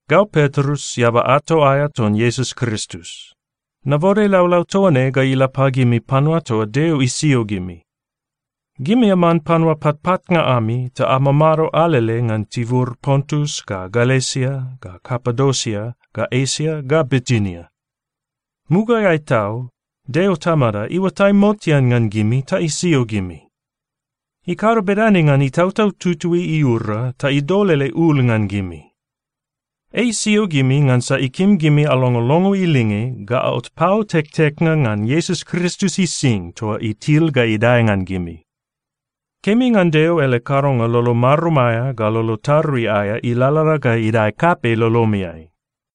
Gau Petrus, eaba ato aea ton Iesus Kristus. Nabode laulau toa ne ga ila pagimi panua toa Deo isio gimi. Gimi aman panua patpatnga ami ta amamado alele ngan tibur Pontus ga Galesia ga Kapadosia ga Esia ga Bitinia. Mugaeai tau Deo Tamada iuatai motean ngan gimi ta isio gimi. Ikado bedane ngan Itautau Tutui iura ta idol ele ul ngan gimi. Ei isio gimi ngansa ikim gimi alongolongo ilinge ga aot pau tekteknga ngan Iesus Kristus ising toa itil ga idae ngan gimi. Kemi ngan Deo ele kadonga lolo marum aea ga lolo tarui aea ilalala ga idae kapei lolomiai.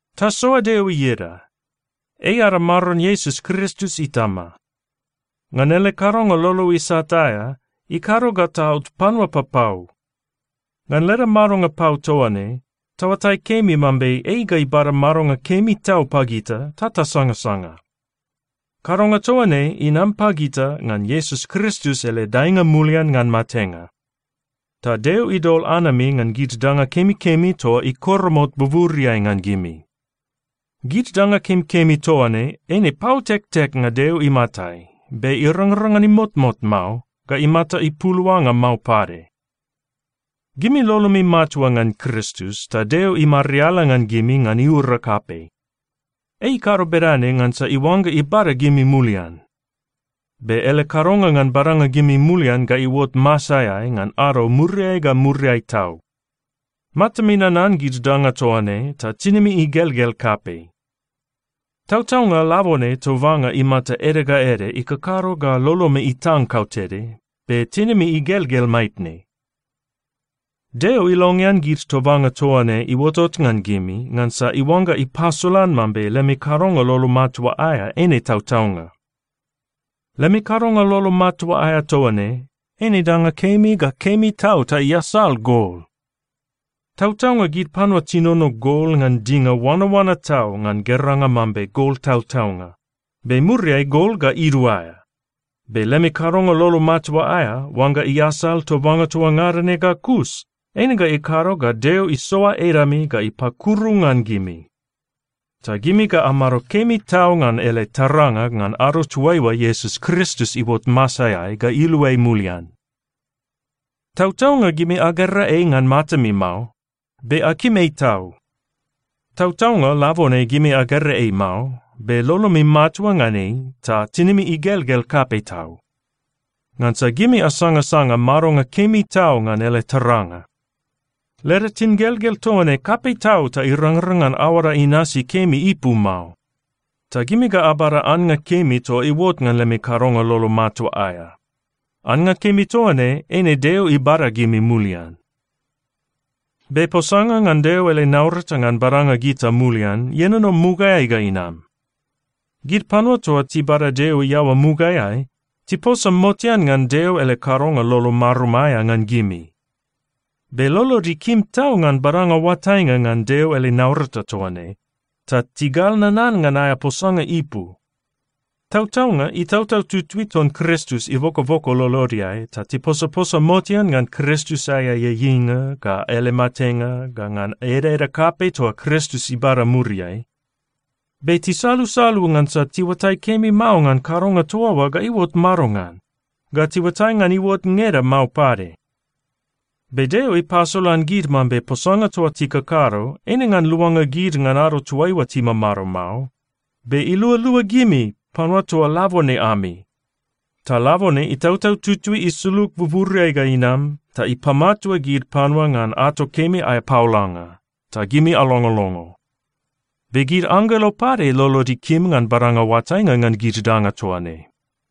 Tasoa Deo ieda! Ei ada Maron Iesus Kristus Itama. Ngan ele kadonga lolo isat aea, ikado ga taot panua papau. Ngan leda madonga pau toa ne, taoatai kemi mambe ei ga ibada madonga kemi tau pagita ta tasangasanga. Kadonga toa ne inam pagita ngan Iesus Kristus ele daenga mulian ngan matenga. Ta Deo idol anami ngan gid danga kemikemi toa ikoromot buburiai ngan gimi. Gid danga kemikemi toa ne eine pau tekteknga Deo imatai, be irangrang ngan imotmot mao ga imata ipuluanga mao pade. Gimi lolomi matua ngan Kristus, ta Deo imariala ngan gimi ngan iura kapei. Ei ikado bedane ngansa iuangga ibada gimi mulian. Be ele kadonga ngan badanga gimi mulian ga iuot masaeai ngan ado muriai ga muriai tau. Matami nanan gid danga toa ne ta tinimi igelgel kapei. Tautaunga labone tobanga imata ede ga ede ikakado ga lolomi itang kautede, be tinimi igelgel maitne. Deo ilongean gid tobanga toa ne iuotot ngan gimi ngansa iuangga ipasolan mambe lemi kadonga lolo matua aea eine tautaunga. Lemi kadonga lolo matua aea toa ne, eine danga kemi ga kemi tau ta iasal gol. Tautaunga gid panua tinono gol ngan dinga oanaoana tau ngan geranga mambe gol tautaunga, be muriai gol ga iduaea. Be lemi kadonga lolo matua aea, oangga iasal tobanga toa ngada ne ga kus, eine ga ikado ga Deo isoa edami ga ipakuru ngan gimi. Ta gimi ga amado kemi tau ngan ele taranga ngan ado toaiua Iesus Kristus iuot masaeai ga iluai mulian. Tautaunga gimi agera ei ngan matami mao, be akim ei tau. Tautaunga labone gimi agera ei mao, be lolomi matua ngan ei ta tinimi igelgel kapei tau, ngansa gimi asangasanga madonga kemi tau ngan ele taranga. Leda tingelgel toa ne kapei tau ta irangrang ngan aoada inasi kemi ipu mao. Ta gimi ga abada annga kemi toa iuot ngan lemi kadonga lolo matua aea. Annga kemi toa ne, eine Deo ibada gimi mulian. Be posanga ngan Deo ele naurata ngan badanga gita mulian ienono mugaeai ga inam. Gid panua toa tibada Deo iaoa mugaeai, tiposa motean ngan Deo ele kadonga lolo marum aea ngan gimi. Be lolod ikim tau ngan badanga oatainga ngan Deo ele naurata toa ne, ta tigal nanan ngan aea posanga ipu. Tautaunga Itautau Tutui ton Kristus ibokoboko lolodeai ta tiposaposa motean ngan Kristus aea ieieinga, ga ele matenga, ga ngan edaeda kapei toa Kristus ibada muriai. Be tisalusalu ngansa tiuatai kemi mao ngan kadonga toa oa ga iuot madongan, ga tiuatai ngan iuot ngeda mao pade. Be Deo ipasolan gid mambe posanga toa tikakado, eine ngan luanga gid ngan ado toaiua timamado mao, be ilualua gimi panua toa labone ami. Ta labone Itautau Tutui isulug buburiai ga inam ta ipamatua gid panua ngan ato kemi aea paolanga, ta gimi alongolongo. Be gid anggelo pade lolod ikim ngan badanga oatainga ngan gid danga toa ne.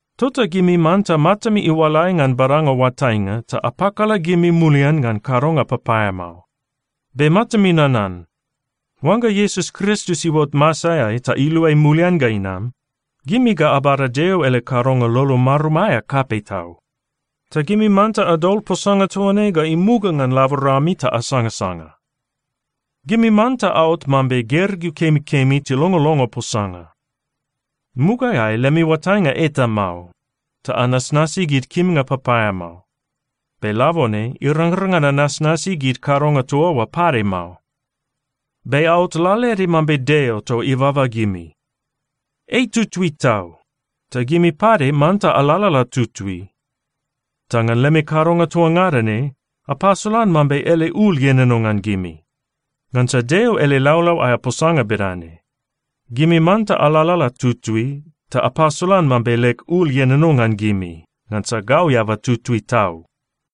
Tota gimi manta matami iualai ngan badanga oatainga ta apakala gimi mulian ngan kadonga papaeamao. Be matami nanan, oangga Iesus Kristus iuot masaeai ta iluai mulian ga inam, gimi ga abada Deo ele kadonga lolo marum aea kapei tau. Ta gimi manta adol posanga toa ne ga imuga ngan laborami ta asangasanga. Gimi manta aot mambe gergeu kemikemi tilongolongo posanga. Mugaeai lemi oatainga eta mao ta anasnasi gid kimnga papaeamao. Be labone irangrang ngan anasnasi gid kadonga toa oa pade mao. Be aot lalaede mambe Deo toa ibaba gimi. Ei tutui tau, ta gimi pade manta alalala tutui. Ta ngan lemi kadonga toa ngada ne, apasolan mambe ele ul ienono ngan gimi. Ngansa Deo ele laulau aea posanga bedane, “Gimi manta alalala tutui ta apasolan mambe leg ul ienono ngan gimi. Ngansa gau eaba tutui tau.”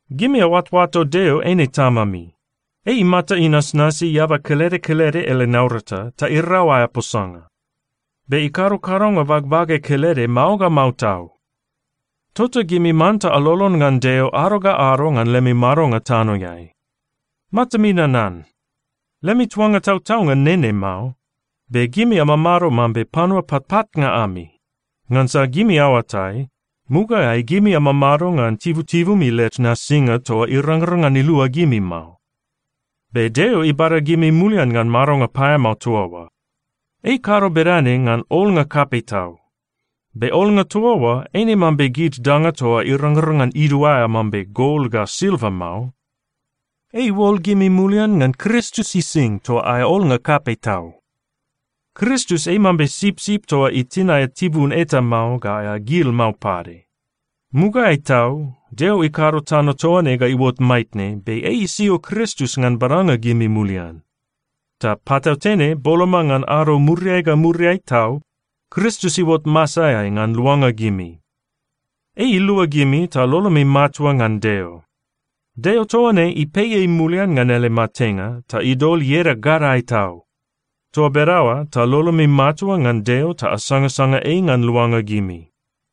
Gimi aoatoato Deo eine Tamami. Ei imata inasnasi eaba kelede kelede ele naurata, ta irau aea posanga. Be ikado kadonga bagbage kelede mao ga mao tau. Tota gimi manta alolon ngan Deo ado ga ado ngan lemi madonga tanoeai. Matami nanan, lemi tuanga tautaunga nene mao. Be gimi amamado mambe panua patpatnga ami. Ngansa gimi aoatai, mugaeai gimi amamado ngan tibutibumi led nasinga toa irangrang ngan ilua gimi mao. Be Deo ibada gimi mulian ngan madonga paeamao toa oa. Ei ikado bedane ngan olnga kapei tau. Be olnga toa oa eine mambe gid danga toa irangrang ngan iduaea mambe gol ga silva mao. Ei iuol gimi mulian ngan Kristus ising toa aea olnga kapei tau. Kristus ei mambe sipsip toa itin aea tibun eta mao ga aea gil mao pade. Mugaeai tau, Deo ikado tano toa ne ga iuot maitne, be ei isio Kristus ngan badanga gimi mulian. Ta patautene, boloma ngan ado muriai ga muriai tau, Kristus iuot masaeai ngan luanga gimi. Ei ilua gimi ta lolomi matua ngan Deo. Deo toa ne ipei ei mulian ngan ele matenga ta idol ieda gadae tau. Toa bedaoa ta lolomi matua ngan Deo ta asangasanga ei ngan luanga gimi.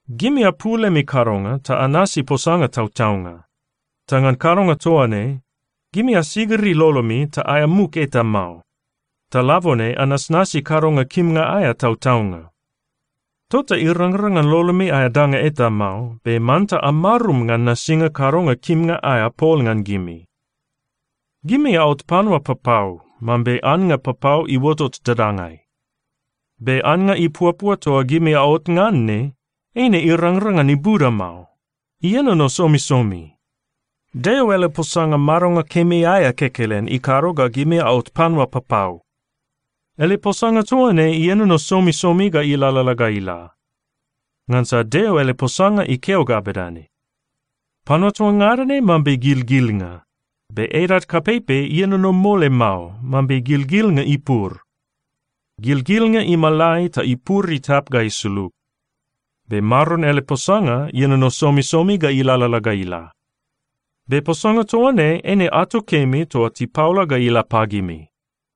Gimi apul lemi kadonga ta anasi posanga tautaunga. Ta ngan kadonga toa ne, gimi asigiri lolomi ta aea muk eta mao. Ta labone anasnasi kadonga kimnga aea tautaunga. Tota irangrang ngan lolomi aea danga eta mao, be manta amarum ngan nasinga kadonga kimnga aea pol ngan gimi. Gimi aot panua papau, mambe annga papau iuotot dadangai. Be annga ipuapua toa gimi aot ngan ne, eine irangrang ngan ibuda mao. Ienono somisomi. Deo ele posanga madonga kemi aea kekelen ikado ga gimi aot panua papau. Ele posanga toa ne ienono somisomi ga ilalala ga ila. Ngansa Deo ele posanga ikeo ga bedane, “Panua toa ngada ne mambe gilgilnga. Be edad kapeipei ienono mole mao, mambe gilgilnga ipur. Gilgilnga imalai ta ipur itap ga isulug. Be Maron ele posanga ienono somisomi ga ilalala ga ila.” Be posanga toa ne eine ato kemi toa tipaola ga ila pagimi.